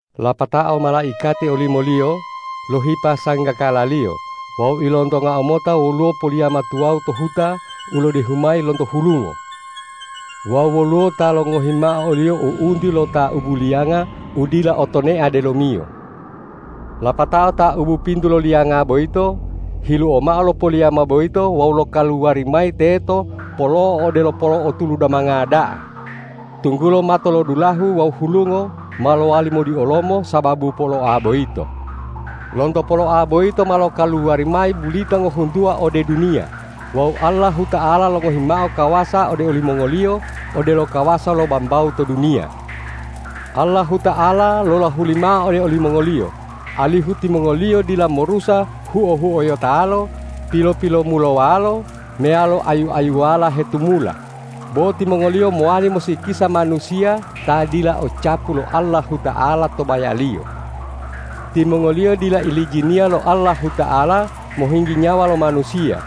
Lapatao malaikati olimoliyo lohipa sanggakalaliyo wawu ilontongau mota woluwo poliyama tuwawu to huta u lodehu mayi lonto hulungo. Wawu woluwo ta longohi mao oliyo u'unti lo taubu liyanga u dila otonea delomiyo. Lapatao taubu pintu lo liyanga boyito hiluo mao lo poliyama boyito wawu lokaluwari mayi teto polo'o odelo polo'o tulu damanga da'a, tunggulo matolodulahu wawu hulungo ma lowali modiolomo sababu poloa boyito. Lonto poloa boyito ma lokaluwari mayi bulita ngohuntuwa ode duniya wawu Allahuta'ala longohi mao kawasa ode olimongoliyo odelo kawasa lo bambawu to duniya. Allahuta'ala lolahuli mao ode olimongoliyo, alihu timongoliyo dila morusa huo-huoyotalo, pilo-pilomulowalo meyalo ayu-ayuwala hetumula, bo timongoliyo mowali mosikisa manusiya ta dila o capu lo Allahuta'ala to bayaliyo. Timongoliyo dila ilijiniya lo Allahuta'ala mohinggi nyawa lo manusiya,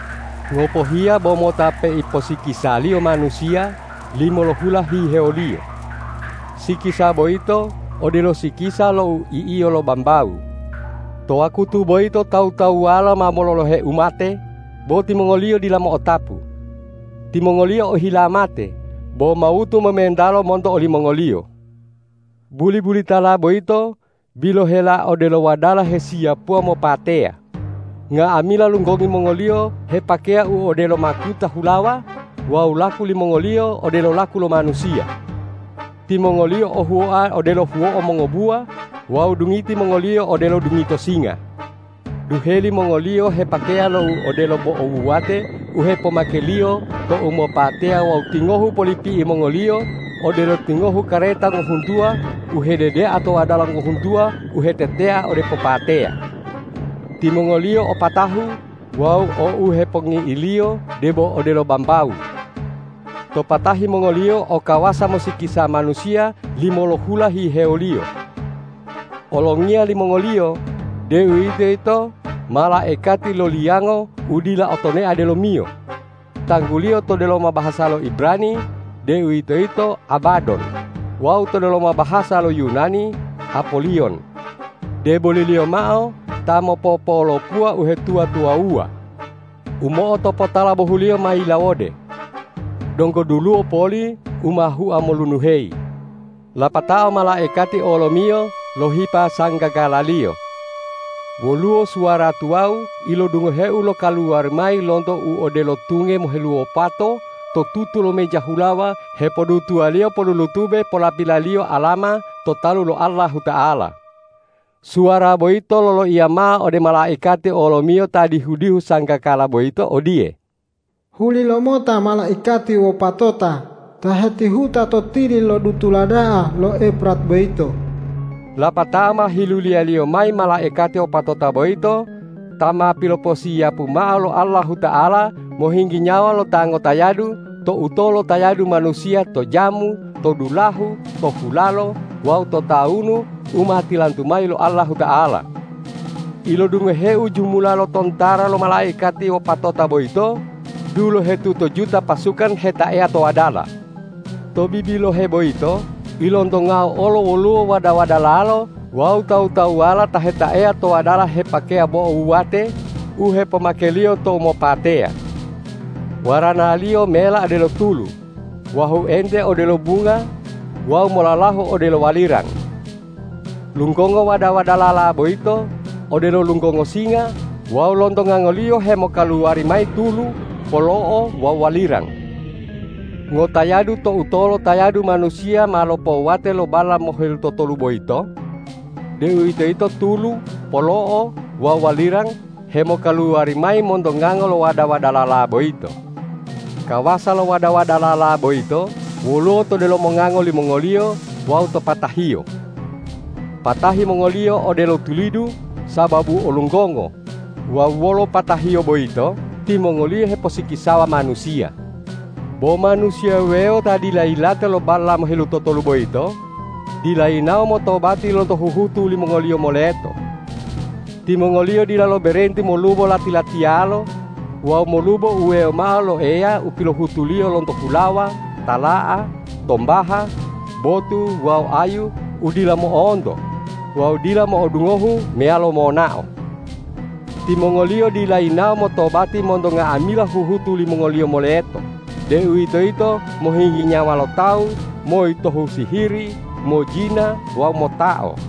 ngopohiya bo mota peiposikisaliyo manusiya limolohula hihewoliyo. Sikisa boyito odelo sikisa lo u i'iyo lo bambawu. To wakutu boyito tawu-tawuwalo ma mololohe umate, bo timongoliyo dila mo'otapu. Timongoliyo ohila mate, bo mawutu momentalo monto olimongoliyo. Buli-bulitala boyito bilohela odelo wadala hesiyapuwa mopateya. Nga'amila lunggongi mongoliyo hepakeya u odelo makuta hulawa wawu laku limongoliyo odelo laku lo manusiya. Timongoliyo o huwoa odelo huwo'o mongobuwa wawu dungiti mongoliyo odelo dungito singa. Duheli mongoliyo hepakeya lo u odelo bo'o wuwate u hepomakeliyo tou mopateya wawu tingohu polipi'i mongoliyo odelo tingohu kareta ngohuntuwa u hededea to wadala ngohuntuwa u hetetea ode popateya. Timongoliyo o patahu wawu o u hepongi'iliyo debo odelo bambawu. To patahi mongoliyo o kawasa mosikisa manusiya limolohula hihewoliyo. Olongiya limongoliyo, deuwitoyito malaikati lo liyango u dila o tonea delomiyo, tangguliyo to delomo bahasa lo Ibrani, deuwitoyito Abadon wawu to delomo bahasa lo Yunani Apoliyon, deboliliyo mao ta mopopolopuwa uhetuwa-tuwawuwa. U mo'otopotala bohuliyo ma yilawode; donggo duluwo poli u ma hua molunuheyi. Lapatao malaikati olomiyo lohipa sanggakalaliyo. Woluwo suwara tuwawu ilodungoheu lokaluwari mayi lonto u odelo tunge moheluwopato to tutu lo meja hulawa hepodutuwaliyo polulutube polapilaliyo alama to talu lo Allahuta'ala. Suwara boyito loloiya mao ode malaikati olomiyo ta dihu-dihu sanggakala boyito odiye,”Huli lomota malaikati wopatota ta hetihuta to tili lo dutula da'a lo Efrat boyito.” Lapatao ma hiluliyaliyo mayi malaikati wopatota boyito ta ma piloposiyapu mao lo Allahuta'ala mohinggi nyawa lo ta ngotayadu to utolo tayadu manusiya to jamu, to dulahu, to hulalo wawu to tawunu u ma tilantu mayi lo Allahuta'ala. Ilodungoheu jumula lo tontara lo malaikati wopatota boyito dulohetutojuta pasukan hetaeya to wadala. To bibilohe boyito ilontongau olo woluwo wada-wadalalo wawu tawu-tawuwala ta hetaeya to wadala hepakeya bo'o wuwate u hepomakeliyo tou mopateya. Waranaliyo mela odelo tulu, wahuente odelo bunga wawu molalahu odelo walirang. Lunggongo wada-wadalala boyito odelo lunggongo singa wawu lonto ngangoliyo hemokaluwari mayi tulu, polo'o wawu walirang. Ngotayadu to utolo tayadu manusiya ma lopowate lo balla mohelutotolu boyito, deuwitoyito tulu, polo'o wawu walirang hemokaluwari mayi monto ngango lo wada-wadalala boyito. Kawasa lo wada-wadalala boyito woluwo to delomo ngango limongoliyo wawu to patahiyo. Patahi mongoliyo odelo tulidu sababu o lunggongo wawu wolo patahiyo boyito timongoliyo heposikisawa manusiya. Bo manusiya wuwewo ta dila yilate lo balla mohelutotolu boyito, dila yinawo motobati lonto huhutu limongoliyo moleto. Timongoliyo dila loberenti molubo lati-latiyalo wawu molubo uwewo mao lo Eya u pilohutuliyo lonto hulawa, tala'a, tombaha, botu wawu ayu u dila mo'onto wawu dila mo'odungohu meyalo monao. Timongoliyo dila yinawo motobati monto nga'amila huhutu limongoliyo moleto, deuwitoyito mohinggi nyawa lo tawu, moyitohu sihiri, mojina wawu motao.